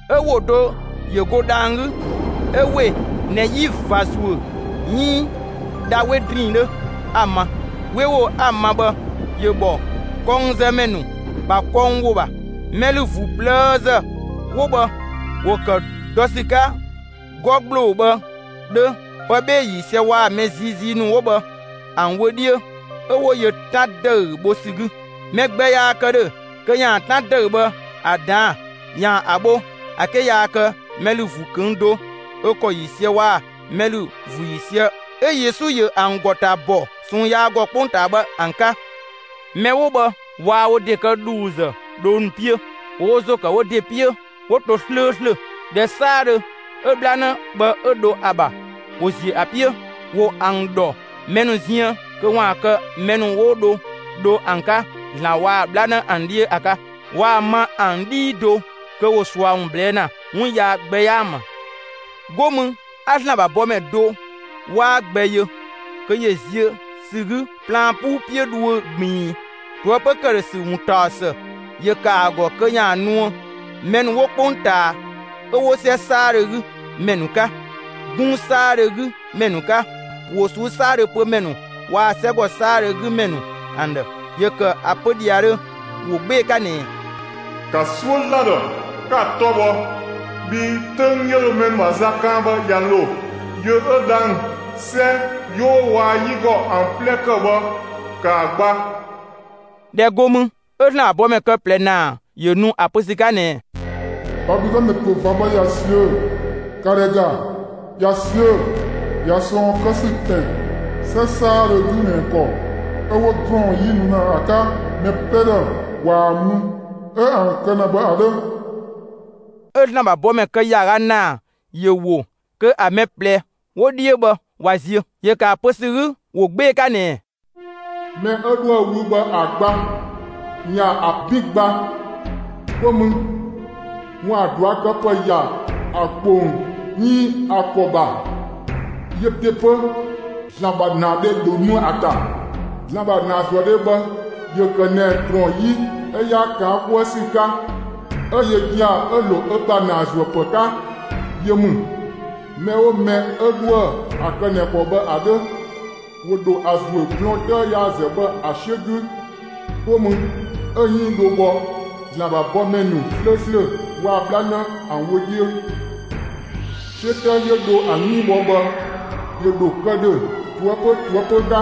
'Ö ‑wo do ‑yö go dhang‑ 'gü 'ö ‑we ꞊nɛ 'yi ꞊va ‑zuö 'iin dha 'we ‑drinng 'dhö, 'a‑ ma. 'We ‑wo 'a‑ ma bhë ‑yö ‑bhɔ kɔngzëmɛ ‑nu ‑bha kɔng ‑wo ‑bha. Mɛ ‑lü ‑vuu ꞊plëëzë 'wo bhë ‑wo ‑kë dɔ ‑sü 'ka 'gɔ ‑gbloo bhë 'dhö, pë 'bhee‑ ‑yiisië waa‑ mɛ ziizii ‑nu 'wo bhë ‑an wö 'dhiö 'ö 'wo yö 'tan ‑dëü bho ‑sü 'gü. Mɛ gbɛ yaa kë ‑dhö kö ‑yaan 'tan ‑dëü bhë ‑a ꞊daan'‑ ‑yaan ‑a bho ‑a 'ke yaa kë mɛ ‑lü ‑vuu ꞊këng' do ö ‑kɔ ‑yiisië waa‑ mɛ ‑lü ‑vuu ‑yiisië 'ö Yesu ‑yö ‑an ‑gɔ ‑ta ‑bɔ ꞊sɔɔn yaa ‑gɔ 'kpongtaa bhë ‑an 'ka. Mɛ 'wo bhë waa wo ‑de kë ‑dhuuzë dhoo ‑nu 'piö, ‑wo wo ‑zo ‑kë wo ‑de 'piö 'wo to 'slööslö. ‑Dhɛ 'saadhö 'ö 'bhlanë bhë 'ö dho ‑a ‑bha, ‑wo ‑ziö ‑a 'piö. ‑Wo ‑an ‑dhɔ mɛ ‑nu ziën kö ‑waan kë mɛ ‑nu 'wo dho dho ‑an 'ka ‑Zlan waa‑ 'bhlanë ‑an 'dhiö ‑a 'ka. Waa‑ ma ‑an 'dhii do kö ‑wo ꞊sua ‑wun ꞊blɛɛ' ‑na; 'wun yaa gbɛ 'yaa ‑an ‑bha. 'Go mü 'a ‑Zlan ‑bha bɔmɛ do 'waa gbɛ yö kö ‑yö ziö ‑sü 'gü plaan 'puu 'piö dhuö ꞊gbiin. ꞊Toëpö ‑këdhösü ‑wuntaɔsë ‑yö ‑kë ‑a ‑gɔ kö ‑yaan nuë mɛ ‑nu 'wo 'kpongtaa 'ö 'wo 'sɛ 'saadhö 'gü ‑mɛ ‑nu 'ka, 'gunng 'saadhö 'gü ‑mɛ ‑nu 'ka, ‑wo ꞊suu'‑ 'saadhö pö ‑mɛ ‑nu waa‑ 'sɛgɔ 'saadhö 'gü ‑mɛ ‑nu ‑an ‑dhë. ‑Yö ‑kë ‑a pö ‑dhiadhö ‑wo 'gbee‑ 'ka ꞊nɛɛ: «‑Ka 'suö ‑Zlan ‑dhë, 'ka‑ 'tɔ bhɔ! Bhii 'töng 'yö dho mɛ ‑nu ‑bha za kaan bhë ꞊ya ‑lo. Yö 'ö dhang‑, 'sɛ, 'yoo waa‑ 'yigɔ ‑an 'plɛ ‑kë bhë, ‑kaa gba!» ꞊Dhɛ go mü, 'ö ‑Zlan ‑bha bɔmɛ kë ꞊plɛ ‑naa ‑yö nu ‑a pö ‑sü 'ka ꞊nɛɛ: «Babilɔnë ‑pö ꞊va bhë ꞊ya ꞊siö'‑, ‑ka ‑dhɛ ‑ga, ꞊ya ꞊siö'‑! ꞊Ya ꞊sɔɔn kë ‑sü ‑pɛn 'sɛ 'saadhö 'gü ꞊nɛ ‑kɔ 'ö 'wo ‑drɔɔn 'yi nu ‑na ‑a 'ka mɛ 'plɛ ‑dhë ꞊waa‑ mü 'ö ‑an kë ‑na bhë ‑a 'dhö!» 'Ö ‑Zlan ‑bha bɔmɛ kë ‑yaaga ‑naa ‑yö ‑wo kö ‑a mɛ ꞊plɛ 'wo 'dhiö bhë ꞊wa ziö. ‑Yö ‑kë ‑a pö ‑sü 'gü ‑wo 'gbee‑ 'ka ꞊nɛɛ: «Mɛ 'ö 'dhoë‑ wü bhë ‑a gba ‑yaan ‑a 'bin gba, 'go mü ‑waan ꞊duakëpë ‑ya ‑a ‑kpong 'iin ‑a ‑kɔ ‑bha, yö ‑de 'pö, ‑Zlan ‑bha ‑naadhe ‑dhö nu ‑a ‑ta. ‑Zlan ‑bha ‑naazuëdhe bhë ‑yö ‑kë ꞊nɛ ‑drɔɔn 'yi 'ö 'yaa ‑kaan 'kuë ‑sü 'ka 'ö yö gia‑ 'ö‑ ‑lo ö ‑bha ‑naazuëpë 'ka, yö ‑mü. Mɛ 'oo mɛ 'yö 'dhoë‑ ‑a kë ꞊nɛ ‑kɔ bhë ‑a 'dhö, ‑wo ‑dho ‑a ‑zuö blɔɔn 'tëë yaazë bhë ‑a 'siö 'gü, 'go mü 'ö‑ 'yënng dho bhɔ ‑Zlan ‑bha bɔmɛ ‑nu 'slööslö waa‑ 'bhlanë ‑an wö 'dhiö. 'Siö 'tëë 'yö dho ‑an 'yënng bhɔ bhë, ‑yö ‑dho kë ‑dhö ꞊toëpö ꞊toëpö 'ka.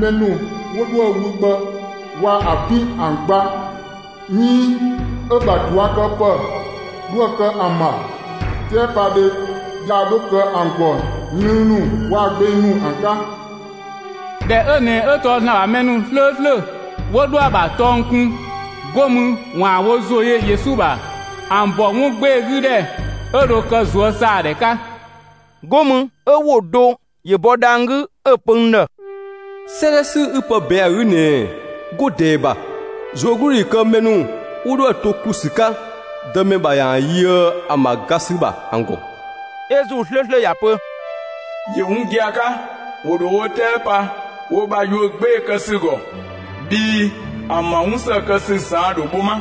Mɛ ‑nu 'wo 'dhoë‑ wü bhë waa‑ ‑a 'bin ‑an gba, 'iin 'ö‑ ‑bha ꞊duakëpë 'dhoë‑ kë ‑an ‑bha, 'tɛɛpadhe yaa 'dho kë ‑an ‑gɔ lënng ‑nu waa‑ gbeng ‑nu ‑an 'ka.» ꞊Dhɛ 'ö ꞊nɛ 'ö tɔɔ ‑Zlan ‑bha mɛ ‑nu 'slööslö 'wo 'dhoë‑ ‑a ‑bha tɔng kun 'go mü ‑waan wo ‑zo yö Yesu ‑bha, ‑an ‑bɔ 'wun 'gbee‑ 'gü ‑dhɛ 'ö dho kë ꞊zuösaadhɛ 'ka. 'Go mü 'ö ‑wo do ‑yö bɔ dhang‑ 'gü 'ö‑ pö n ‑dhë: «'Sëëdhɛ 'sü 'ü pë ꞊bɛɛn'‑ ‑a 'gü ꞊nɛɛ: 'Go ꞊dɛɛ ‑bha, ꞊zuögludhi ‑yö kë mɛ ‑nu 'wo 'dhoë‑ to ‑klu ‑sü 'ka Dëmɛ ‑bha ‑yaan yöë ‑an ‑bha ga ‑sü ‑bha ‑an ‑gɔ!» 'Ö ‑Zuu 'slööslö ‑ya ‑pö: «‑Yö 'wun gia‑ 'ka, ‑wo ‑dho wo 'tɛɛ pa wo ‑bha yuö 'gbee‑ kë ‑sü ‑gɔ bhii ‑an ‑bha 'wun ‑së kë ‑sü ꞊saan' ‑dho bho 'ma.»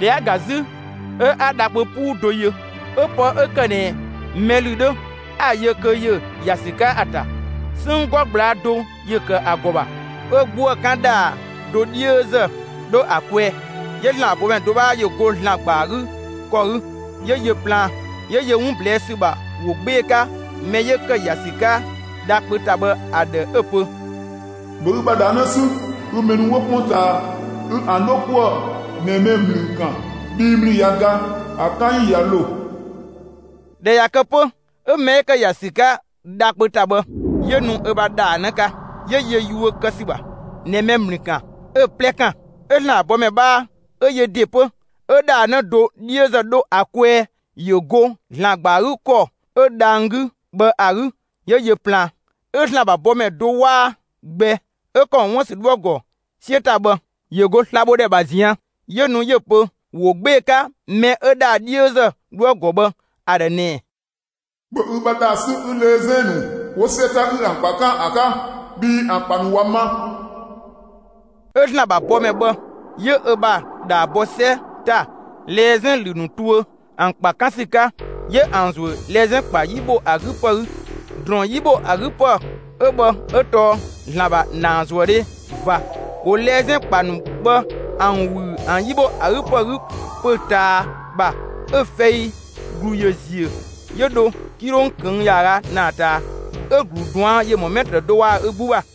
꞊Dhɛ 'a‑ ga 'zü, 'ö 'a dha kpö 'puu do yö; 'ö pë 'ö ‑kë ꞊nɛ mɛ ‑lü 'dhö 'a‑ yö kö ‑yö ‑ya ‑sü 'ka ‑a ‑ta. 'Sënng 'gɔ ꞊gblaa' do ‑yö ‑kë ‑a ‑gɔ ‑bha, 'ö 'gbuë‑ 'kan ‑dhaa do 'dhiözë 'dho ‑a kwɛɛ. 'Yö ‑Zlan ‑bha bɔmɛ do 'bhaa ‑yö go ‑Zlan ‑gba ‑a 'gü ‑kɔ 'gü 'yö yö plaan, 'yö yö 'wun ꞊blɛɛ' ‑sü ‑bha ‑wo 'gbee‑ 'ka mɛ 'yö ‑kë ‑ya ‑sü 'ka dha kpö ‑ta bhë ‑a ‑dhë 'ö‑ pö: «‑Bhö ü ‑bha ‑dhaa 'në 'sü, 'ö mɛ ‑nu 'wo 'kpongtaa, 'ü ‑an 'dho 'kuë‑ ꞊nɛ ꞊dhɛ 'wo ‑mlü ‑kan bhii ‑mlü ꞊ya ga. ‑A 'kan ‑yi ꞊ya ‑lo.» ꞊Dhɛ ꞊ya kë 'pö 'ö mɛ 'ö ‑kë ‑ya ‑sü 'ka dha kpö ‑ta bhë 'yö nu ö ‑bha ‑dhaa 'në 'ka, ‑yö yö yuö kë ‑sü ‑bha ꞊nɛ mɛ ‑mlü ‑kan, 'ö‑ 'plɛ ‑kan. 'Ö ‑Zlan ‑bha bɔmɛ 'bhaa 'ö yö ‑de 'pö ö ‑dhaa 'në do 'dhiözë 'dho ‑a kwɛɛ ‑yö go ‑Zlan ‑gba ‑a 'gü ‑kɔ 'ö dhang‑ 'gü bhë ‑a 'gü 'yö yö plaan. 'Ö ‑Zlan ‑bha bɔmɛ do 'waa gbɛ 'ö ‑kɔ ‑mɔ 'wuën‑ ‑sü 'dhoë‑ ‑gɔ 'siö ‑ta bhë, ‑yö go slabhodhɛ ‑bha ꞊zian', 'yö nu 'yö‑ pö ‑wo 'gbee‑ 'ka mɛ 'ö ‑dhaa 'dhiözë 'dhoë‑ ‑gɔ bhë ‑a ‑dhë ꞊nɛɛ: «‑Bhö ü ‑bha ‑dhaa 'sü 'ü lɛzɛn ‑nu 'wo 'sɛ ‑ta 'ü ‑an ‑kpa 'kan ‑a 'ka, bhii ‑an ‑kpa ‑nu ꞊wa ma.» 'Ö ‑Zlan ‑bha bɔmɛ bhë 'yö ö ‑bha ‑dhaa bɔ 'sɛ ‑ta lɛzɛn ‑lü ‑nu tuö ‑an ‑kpa 'kan ‑sü 'ka, 'yö ‑an ‑zuö lɛzɛn ‑kpa 'yi ‑bho ‑a 'gü ‑pë 'gü. ‑Drɔɔn 'yi ‑bho ‑a 'gü ‑pë 'ö bhë 'ö tɔɔ ‑Zlan ‑bha ‑naazuëdhe ꞊va. ‑Wo lɛzɛn ‑kpa ‑nu bhë ‑an ꞊wüü ‑an 'yi ‑bho ‑a 'gü ‑pë 'gü pö‑ ꞊taa ‑bha, 'ö fɛi ‑glu ‑yö ziö 'yö dho 'kilong ꞊këng' ‑yaaga ‑naa ꞊taa 'ö‑ ‑glu ꞊duan' ‑yö ‑mɔ 'mɛtrë do waa‑ ö 'gbu ‑bha.